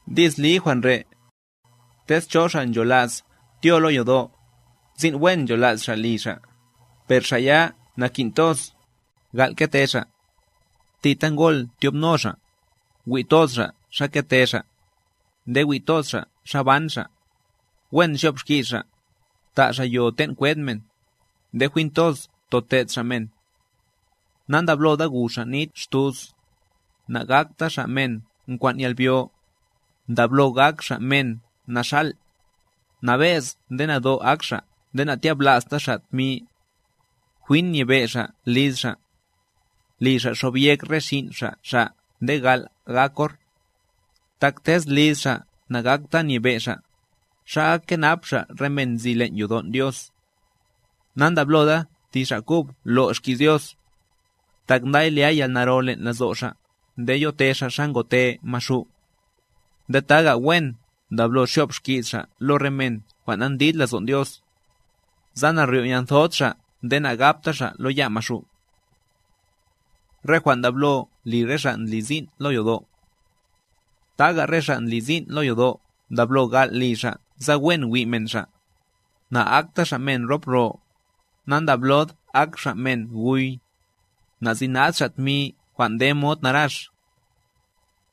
Di's li jwan' re': tez cho xa' ncholas tyo lo yodo', sin' wen nchola's xa' li xa'. Per xa' ya nakin' toz, gal' kete xa', thita ngol tyobno xa', wi' toz xa' xa kete xa', nde wi' toz xa' xa ban xa', wen xyo'b xki's xa', ta' xa' yo ten' kwed men, nde jwin toz tote'd xa' men. Nandabloda gu xa' nit xtus, nagakta xa' men nkwan' yalbyo, ndablo gak xa' men naxal', nabe'z nde nado' ak xa' nde na'tyabla'sta xa' tmi. Jwin nyebe' xa' liz xa', li xa' xobyek re xin' xa' xa' nde gal' gak or; (tak tez liz xa' na'akta nyebe' xa', ¿xa ak kenap xa' re men nzi len' yodon' Dios?); na'ndabloda thi xa' kub lo' xki's Dios, tak nday lya yalnaro len' lazo' xa' nde yote xa' xa ngote Maxu'. Nde taga' wen ndablo xyo'b xki's xa' lo re men jwan' nandlid lazon' Dios, sa naryo'yanthod xa' nde nagapta xa' lo ya' Maxu'. Re jwan' ndablo li re xa' ndli sin' lo yodo' Taga re xa' ndli sin' lo yodo'a ndablo gal' li xa' sa wen wi' men xa', na'akta xa' men rop ro, nandablod ak xa' men guy, na'sinad xa' tmi jwan' nde mod narax.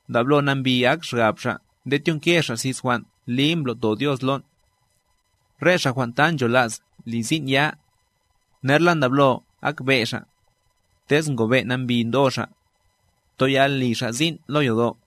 Ndablo nambi ak xgab xa' nde tyonke xa' xis jwan' li mblo'to Dios lon'. Re xa' jwan' ta nchola's li sin' ya', nerla ndablo ak be' xa', tez ngobe' nambi ndo xa', toyal li xa' sin' lo yodo'.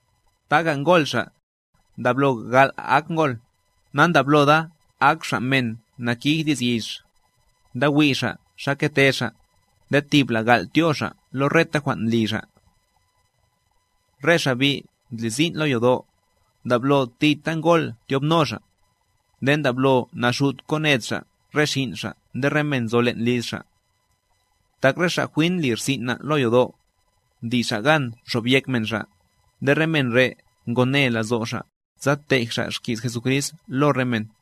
Taga' ngol xa', ndablo gal' ak ngol, nandabloda ak xa' men nakij di's yix, ndawi' xa' xa kete xa', nde thibla' gal' tyo xa' lo reta jwan' ndli xa'. Re xa' bi' ndli sin' lo yodo', ndablo thita ngol tyobno xa', nde ndablo naxut koned xa' re xin' xa' nde re men nzo len' liz xa'. Tak re xa' jwin ndli rsin' na' lo yodo', ndli xa' gan xob yek men xa', nde re jwan' re' ngone lazo' xa' sa tej xa' xki's Jesucrist lo re men.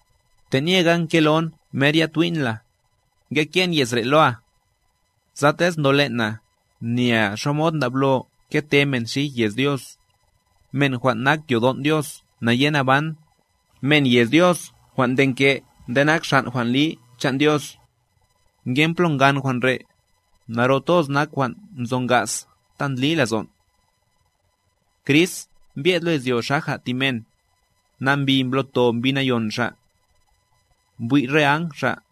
Te'nyega nkelon mer ya twi'n la, ngeke'n ye's re' loa, sa tez ndolen' na, nyea xamod ndablo kete men xij yez Dios, men jwan' nak yodon' Dios nayenaban, men yez Dios jwan' ndenke' nde nak xan' jwan' li chan' Dios. Ngen plo ngan jwan' re', naro toz nak jwan' nzo naga's ta ndli lazon': Crist mbye'd lo izyo xaja' thi men Nambi mblo'to Mbi Nayon Xa'. Mbwi' re áng Xa'.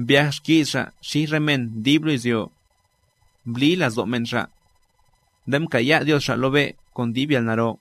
Mbyaj xki's Xa' xij re men dib lo izyo, Mbli lazon' men Xa', Nde mkaya' Dios Xa' lo be' kon dib yalnaro.